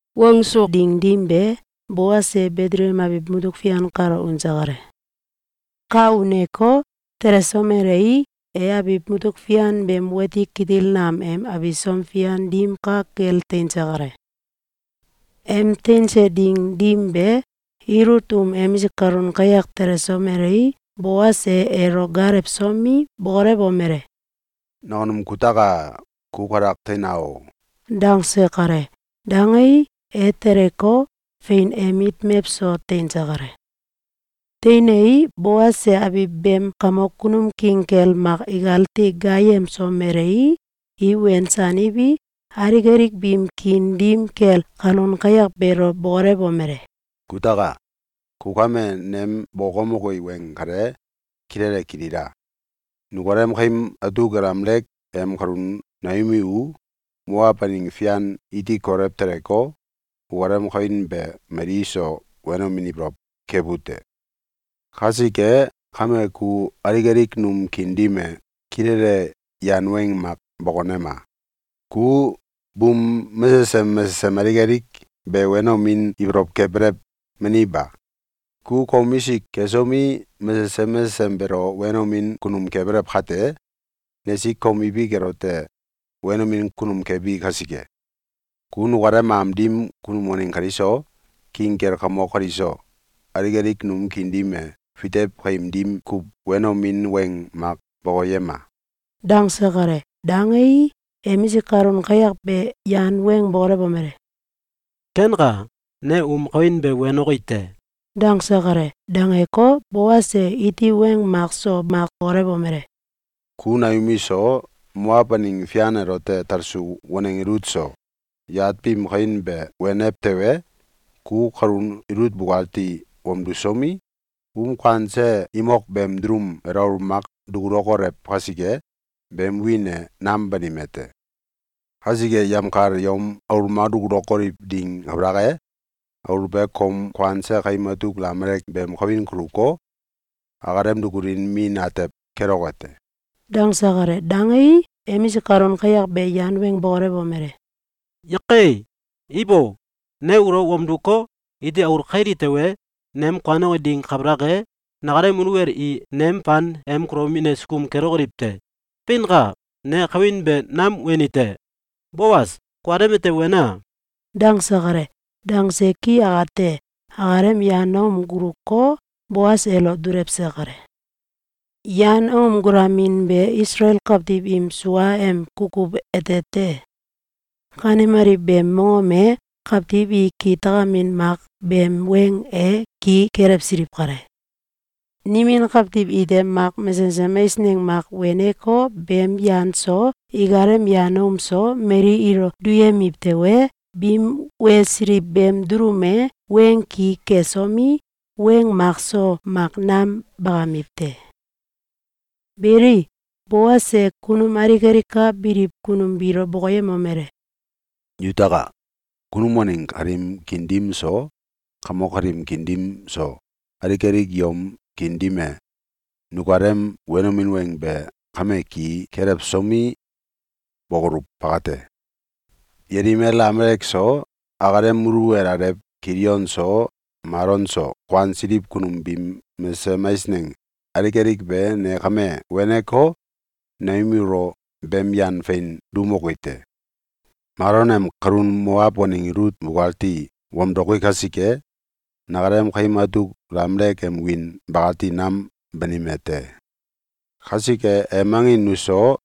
Wangsu ding dim be, Boas e Betelekem abiw mutuk fian kalo unse kale. Ka uneko, telesomelei, e abiw mutuk fian beem wati kitil nam em abisom fian dim ka kel teinse kale. Em teinse ding dim be, Ilut um emisik kalun kayak telesomelei, Boas e elo gaalewsomi, bokolewomele: “Nakunum kutaka! Ku kalak teina o!”, dangse kale. Dangei, e teleko, fein em mit mewso teinse kale. Teinei, Boas e abiw beem kamok kunum king kel mak ikati gaayemsomelei, i wensaniwi, alik alik biim kiin dim kel kalun kayak beelo bokolewomele: “Kutaka! Ku kame nem bokokemoki weng kale kilele kilila! Nukalem kaim atuk Elimelek em kalun Noomi u Moaw aneng fian iti kolew teleko, ukalem kawin be mali iso wenomin ibolow kebu te. Kasike kame ku alik alik num kiin dim e kilele yan weng mak bokonema! Ku buum mesesem mesesem alik alik be wenomin ibolow kebelew, meni ba? Ku komisik kesomi, mesesem mesesem beelo wenomin kunum kebelew kate, nesik kom ibik elote wenomin kunum kebi kasike. Ku nukalem am dim kunum waneng kaliso, king kel kamok kaliso, alik alik num kiin dim e fitew kaim dim kuw wenomin weng mak bokoyema!”, dangse kale. Dangei, emisik kalun kayak be yan weng bokolewomele: “Kenka! Ne um kawin be wenoki te.”, dangse kale. Dangeko, Boas e iti weng mak so mak bokolewomele: “Ku Noomi so, Moaw aneng fian elote talsu waneng Ilut so, yat biim kawin be wenew tewe, ku kalun Ilut bukati wamdusomi, um kuanse imok beem dulum elo aul mak dukulokolew kasike, beem wiin e nam banime te! Kasike, yemkal yom aul mak dukulokoliw ding kabalak e, aul be kom kuanse kaim atuk Elimelek beem kawin kuluko, akalem dukulin min atew keloke te.”, dangse kale. Dangei, emisik kalun kayak be yan weng bokolewomele: “Yake! Ibo! Ne ulo wamduko, iti aul kaili tewe, nem kuanoki ding kabalak e, nakalem muluwel i nem fan em kulomin e sukum kelokoliw te. Feinka! Ne kawin be nam weni te. Boas, kukalem ete wena!”, dangse kale. Dangse ki akate, akalem yan aom guluko, Boas elo dulewse kale. (Yan aom gulamin be Isalael kawtiw im suaem kukuw ete te. Kanemaliw beem mongom ete kawtiw i kitakamin mak beem weng e ki kelewsiliw kale. Nimin kawtiw ite mak mesesem eisneng mak weneko, beem yan so, ikalem yan aom so, mali ilo duyemiw tewe, biim wesiliw beem dulum elote weng ki kesomi, weng makso mak nam bakamiw te.) Beli, Boas e kunum alik alik ka biliw kunum biilo bokoyemomele: “Yutaka! Kunum waneng kaliim kiin dim so, kamok kaliim kiin dim so, alik alik yom kiin dim e nukalem wenomin weng be kame ki kelewsomi, bokoluw bakate. Yelimel Elimelek so, akalem muluwel alew Kilion so, Malon so, kuansiliw kunum biim mesesem eisneng alik alik be ne kame weneko, Noomi ulo beem yan fein duumoki te. Malon em kalun Moaw waneng Ilut bukati wamdoki kasike, nakalem kaim atuk Elimelek em wiin bakati nam banime te. Kasike, em angin nuso,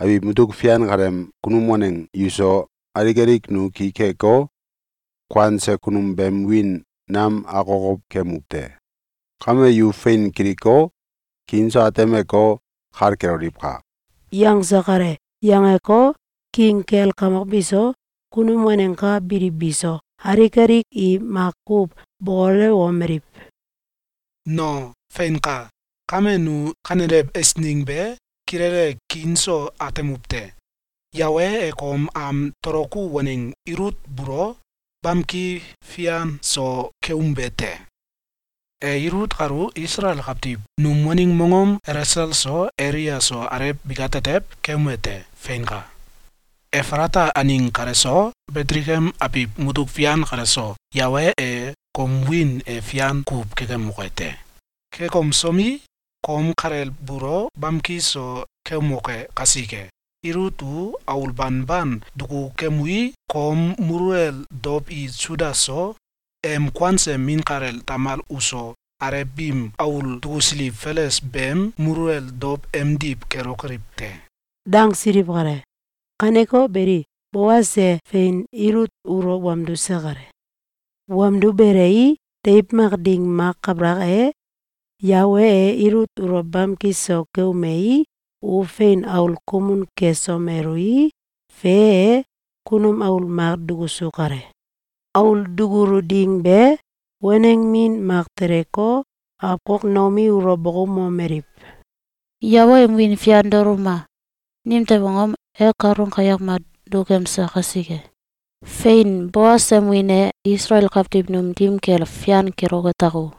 abiw mutuk fian kaleem kunum waneng yuso, alik alik nu ki keko, kuanse kunum beem wiin nam akokow kemuw te. Kame yu fein kiliko, kiin so atemeko, kal keloliwka!”, yangse kale. Yangeko, king kel kamok biso, kunum waneng ka biliw biso, alik alik i makuw bokolewomeliw: “No, feinka! Kame, nu kanelew eisneng be kilele kiin so atemuw te! Yawe e kom am toloku waneng Ilut buulo bamki fian so keumbe te! E Ilut kalu Isalael kawtiw num waneng mongom Elesel so Elea so alew bikatetew keume te! Feinka! Efalata aneng kale so, Betelekem abiw mutuk fian kale so, Yawe e kom wiin e fian kuw kekemoke te! Kekemsomi, kom kalel buulo bamki so keumoke kasike, Ilut u aul banban dukukemui, kom muluwel dow i Suda so, em kuanse min kalel Tamal uso, alew biim aul dukusiliw Feles beem muluwel dow emdiw kelokoliw te!”, dangsiliw kale. Kaneko beli, Boas e fein Ilut ulo wamduse kale. Wamdubelei, deiw mak ding mak kabalak e, Yawe e Ilut ulo bamki so keumei, u fein aul kumun kesomelui, fe e, kunum aul mak dukusu kale. Aul dukulu ding be, waneng min mak teleko, awkok Noomi ulo bokoumomeliw: “Yawe em wiin fian daoluma! Nimtew angom? E kalun kayak mak dukemse kasike. Fein! Boas em wiin e Isalael kawtiw num dim kel fian keloke tako!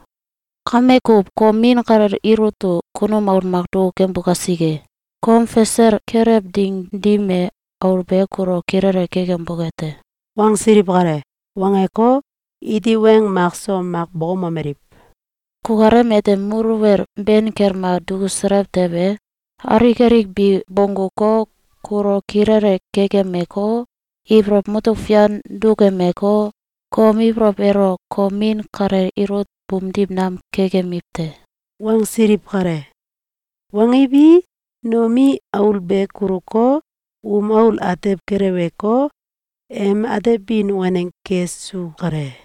Kame kuw, kom min kalel Ilut u kunum aul mak dukukembu kasike! Kom fasel kelew ding dim e, aul be kulo kilele kekemboke te.”, wangsiliw kale. Wangeko, iti weng mak so mak bokoumomeliw: “Kukalem ete muluwel ben kel mak dukuselew tewe, alik alik bi bongguko, kulo kilele kekemeko, ibolow mutuk fian dukemeko, kom ibolow elo kom min kalel Ilut buumdiw nam kekemiw te.”, wangsiliw kale. Wangiwi, Noomi aul be kuluko, um aul atew keleweko, em atebin waneng kesu kale.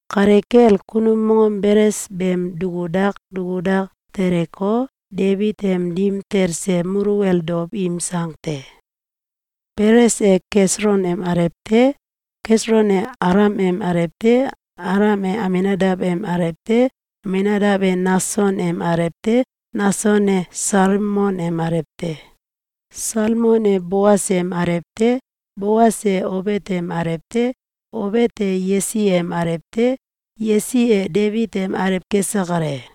Kale kel kunum mongom Beles beem dukudak dukudak teleko, Debit em dim talse muluwel dow im sang te: Beles e Keselon em alew te. Keselon e Alam em alew te. Alam e Aminadaw em alew te. Aminadaw e Nakson em alew te. Nakson e Salmon em alew te. Salmon e Boas em alew te. Boas e Obet em alew te. Obet e Yesi em alew te. Yesi e Debit em alew kese kale.